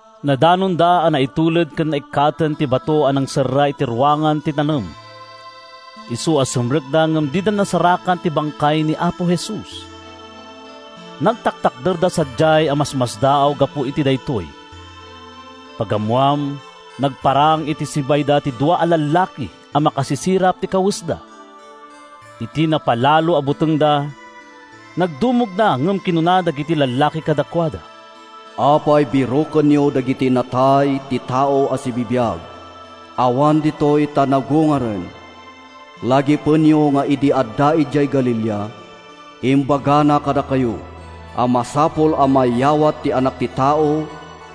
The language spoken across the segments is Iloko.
Nadanonda a naitulid ken naikkaten ti bato a nangserra iti ruangan ti tanem, isu a simrekda ngem dida nasarakan ti bangkay ni Apo Jesus. Nagtatakderda sadiay a masmasdaaw gapu iti daytoy. Pagammoan, nagparang iti sibayda ti dua a lallaki a makasisirap ti kawesda. Iti napalalo a butengda, nagdumogda ngem kinuna dagiti lallaki kadakuada: “Apay a birokenyo kadagiti natay ti tao a sibibiag? Awan ditoy, ta napagungaren. Lagipenyo nga idi adda idiay Galilea, imbagana kadakayo a masapul a mayawat ti Anak ti Tao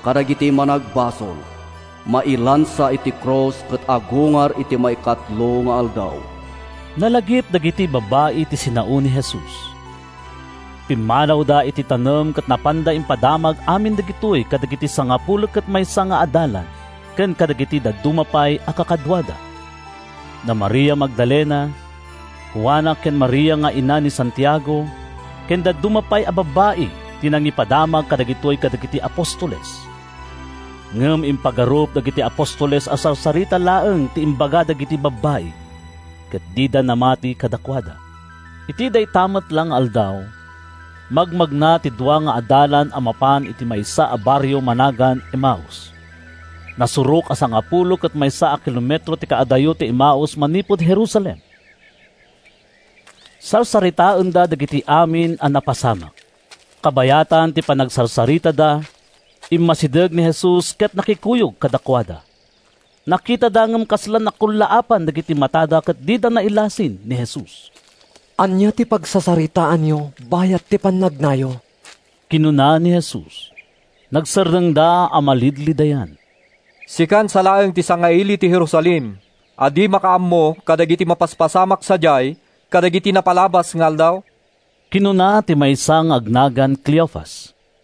kadagiti managbasol, mailansa iti krus ket agungar iti maikatlo nga aldaw.” Nalagip dagiti babbai ti sinao ni Jesus. Pimmanawda iti tanem ket napanda impadamag amin dagitoy kadagiti sangapulo ket maysa nga adalan ken kadagiti dadduma pay a kakaduada. Da Maria Magdalena, Juana ken Maria nga ina ni Santiago ken dadduma pay a babbai ti nangipadamag kadagitoy kadagiti apostoles. Ngem impagarup dagiti apostoles a sarsarita laeng ti imbaga dagiti babbai, ket dida namati kadakuada. Iti dayta met la nga aldaw, magmagna ti dua nga adalan a mapan iti maysa a barrio a managan Emaus. Nasurok a sangapulo ket maysa a kilometro ti kaadayo ti Emaus manipud Jerusalem. Sarsaritaenda dagiti amin a napasamak. Kabayatan ti panagsarsaritada, immasideg ni Jesus ket nakikuyog kadakuada. Nakitada ngem kasla nakullaapan dagiti matada ket dida nailasin ni Jesus. “Ania ti pagsarsaritaanyo bayat ti pannagnayo?” kinuna ni Jesus. Nagsardengda a malidlidayan. “Sikan sa laeng ti sangaili iti Jerusalem a di makaammo kadagiti napaspasamak sadiay kadagiti napalabas nga aldaw!” kinuna ti maysa nga agnagan Cleofas.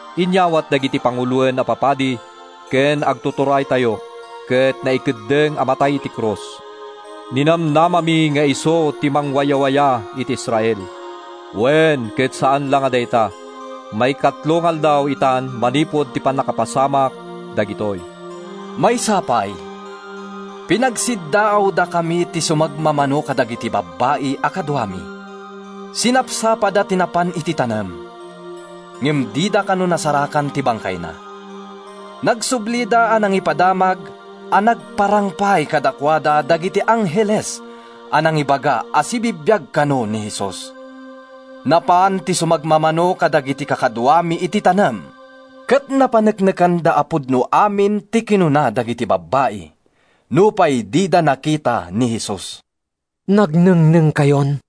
Inyawat dagiti panguloen a papadi ken agtuturaytayo ket naikeddeng a matay iti krus. Ninamnamami nga isu ti mangwayawaya iti Israel! Wen, ket saan la a dayta, maikatlo nga aldaw itan manipud pannakapasamak dagitoy. Maysa pay, pinagsiddaawdakami ti sumagmamano kadagiti babbai a kaduami. Sinapsapada ti napan iti tanem, ngem dida kano nasarakan ti bangkayna. Nagsublida a nangipadamag a nagparang pay kadakuada dagiti angheles a nangibaga a sibibiag kano ni Jesus. Napan ti sumagmamano kadagiti kakaduami iti tanem ket napaneknekanda a pudno amin ti kinuna dagiti babbai, nupay dida nakita ni Jesus.” “Nagnengnengkayon!”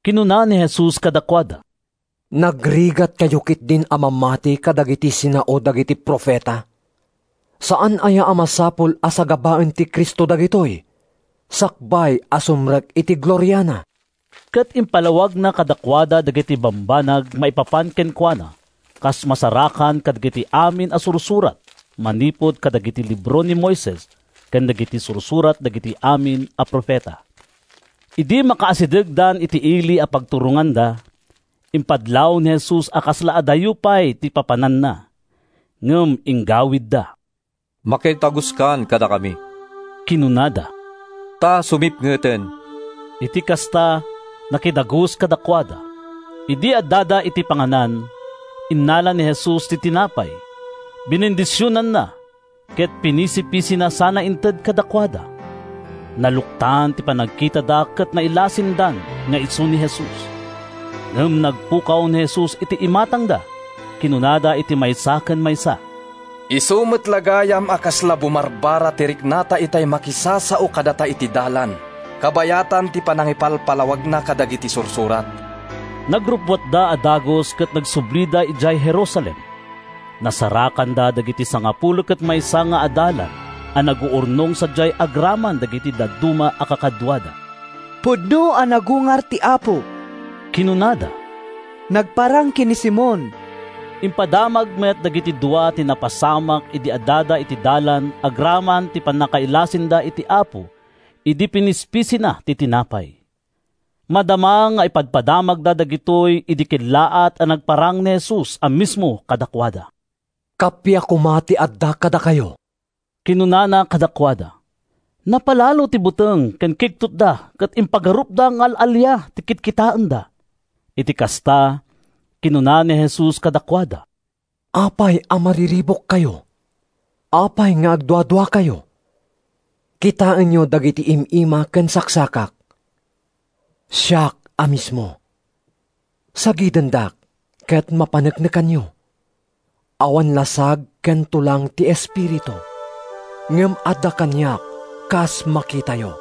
kinuna ni Jesus kadakuada. “Nagrigatkayo ketdin a mamati kadagiti sinao dagiti profeta! Saan aya a masapul a sagabaen ti Cristo dagitoy, sakbay a sumrek iti gloriana?” Ket impalawagna kadakuada dagiti bambanag maipapan kenkuana kas masarakan kadagiti amin a Sursurat manipud kadagiti libro ni Moises ken dagiti sursurat dagiti amin a profeta. Idi makaasidegdan iti ili a pagturonganda, impadlaw ni Jesus a kasla adayo pay ti papananna. Ngem inggawidda. “Makidaguskan kadakami,” kinunada, “ta sumipngeten.” Iti kasta, nakidagus kadakuada. Idi addada iti panganan, innala ni Jesus ti tinapay, binendisionanna, ket pinispisina sana inted kadakuada. Naluktan ti panagkitada ket nailasindan nga isu ni Jesus. Ngem nagpukaw ni Jesus iti imatangda. Kinunada iti maysa ken maysa, “Isu met la gayam a kasla bumarbara ti riknata itay makisasao kadata iti dalan kabayatan ti panangipalpalawagna kadagiti Sursurat!” Nagrubbuatda a dagus ket nagsublida idiay Jerusalem. Nasarakanda dagiti sangapulo ket maysa nga adalan a naguurnong sadiay agraman dagiti dadduma a kakaduada. “Pudno a nagungar ti Apo!” kinunada. “Nagparang ken ni Simon.” Impadamag met dagiti dua ti napasamak idi addada iti dalan agraman ti pannakailasinda iti Apo idi pinispisina ti tinapay. Madama nga ipadpadamagda dagitoy idi kellaat a nagparang ni Jesus a mismo kadakuada. “Kappia koma ti adda kadakayo,” kinunana kadakuada. Napalalo ti buteng ken kigtotda ket impagarupda nga al-alia ti kitkitaenda. Iti kasta, kinuna ni Jesus kadakuada, “Apay a mariribukkayo? Apay nga agduaduakayo? Kitaenyo dagiti im-ima ken saksakak. Siak a mismo! Sagidendak ket mapaneknekanyo. Awan lasag ken tulang ti espiritu, ngem adda kaniak kas makitayo.”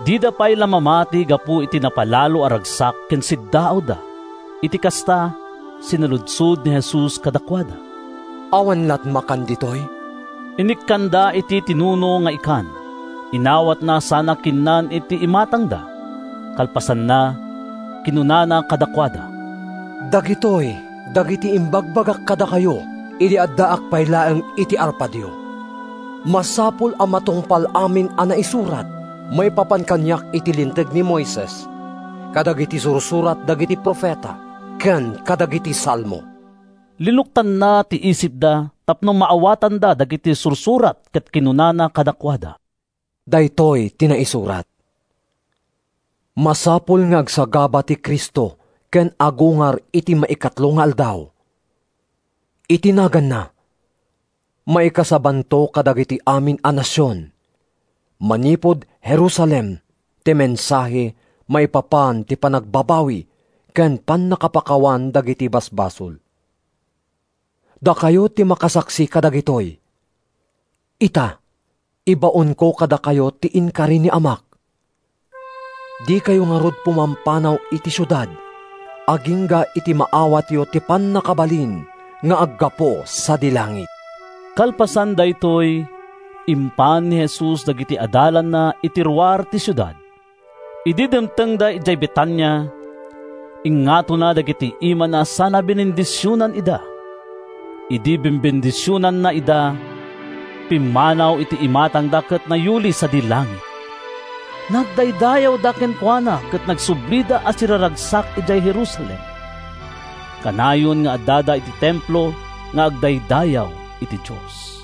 Dida pay la mamati gapu iti napalalo a ragsak ken siddaawda. Iti kasta, sinaludsod ni Jesus kadakuada, “Awan lat’ makan ditoy?” Inikkanda iti tinuno nga ikan. Inawatna sana kinnan iti imatangda. Kalpasanna, kinunana kadakuada, “Dagitoy dagiti imbagbagak kadakayo idi addaak pay laeng iti arpadyo. Masapul a matungpal amin a naisurat maipapan kaniak iti Linteg ni Moises, kadagiti sursurat dagiti profeta, ken kadagiti Salmo.” Linuktanna ti isipda tapno maawatanda dagiti Sursurat ket kinunana kadakuada, “Daytoy ti naisurat: ‘Masapul nga agsagaba ti Cristo ken agungar iti maikatlo nga aldaw. Iti naganna, maikasabanto kadagiti amin a nasion, manipud Jerusalem, ti mensahe maipapan ti panagbabawi ken pannakapakawan dagiti basbasol.’ Dakayo ti makasaksi kadagitoy. Ita, ibaonko kadakayo ti inkari ni Amak. Dikayo ngarud pumampanaw iti siudad agingga iti maawatyo ti pannakabalin nga aggapu sadi langit.” Kalpasan daytoy, impan ni Jesus dagiti adalanna iti ruar ti siudad. Idi dimtengda idiay Betania, ingngatona dagiti imana sana binendisionan ida. Idi bembendisionanna ida, pimmanaw iti imatangda ket nayuli sadi langit. Nagdaydayawda kenkuana ket nagsublida a siraragsak idiay Jerusalem. Kanayon nga addada iti Templo nga agdaydayaw iti Dios.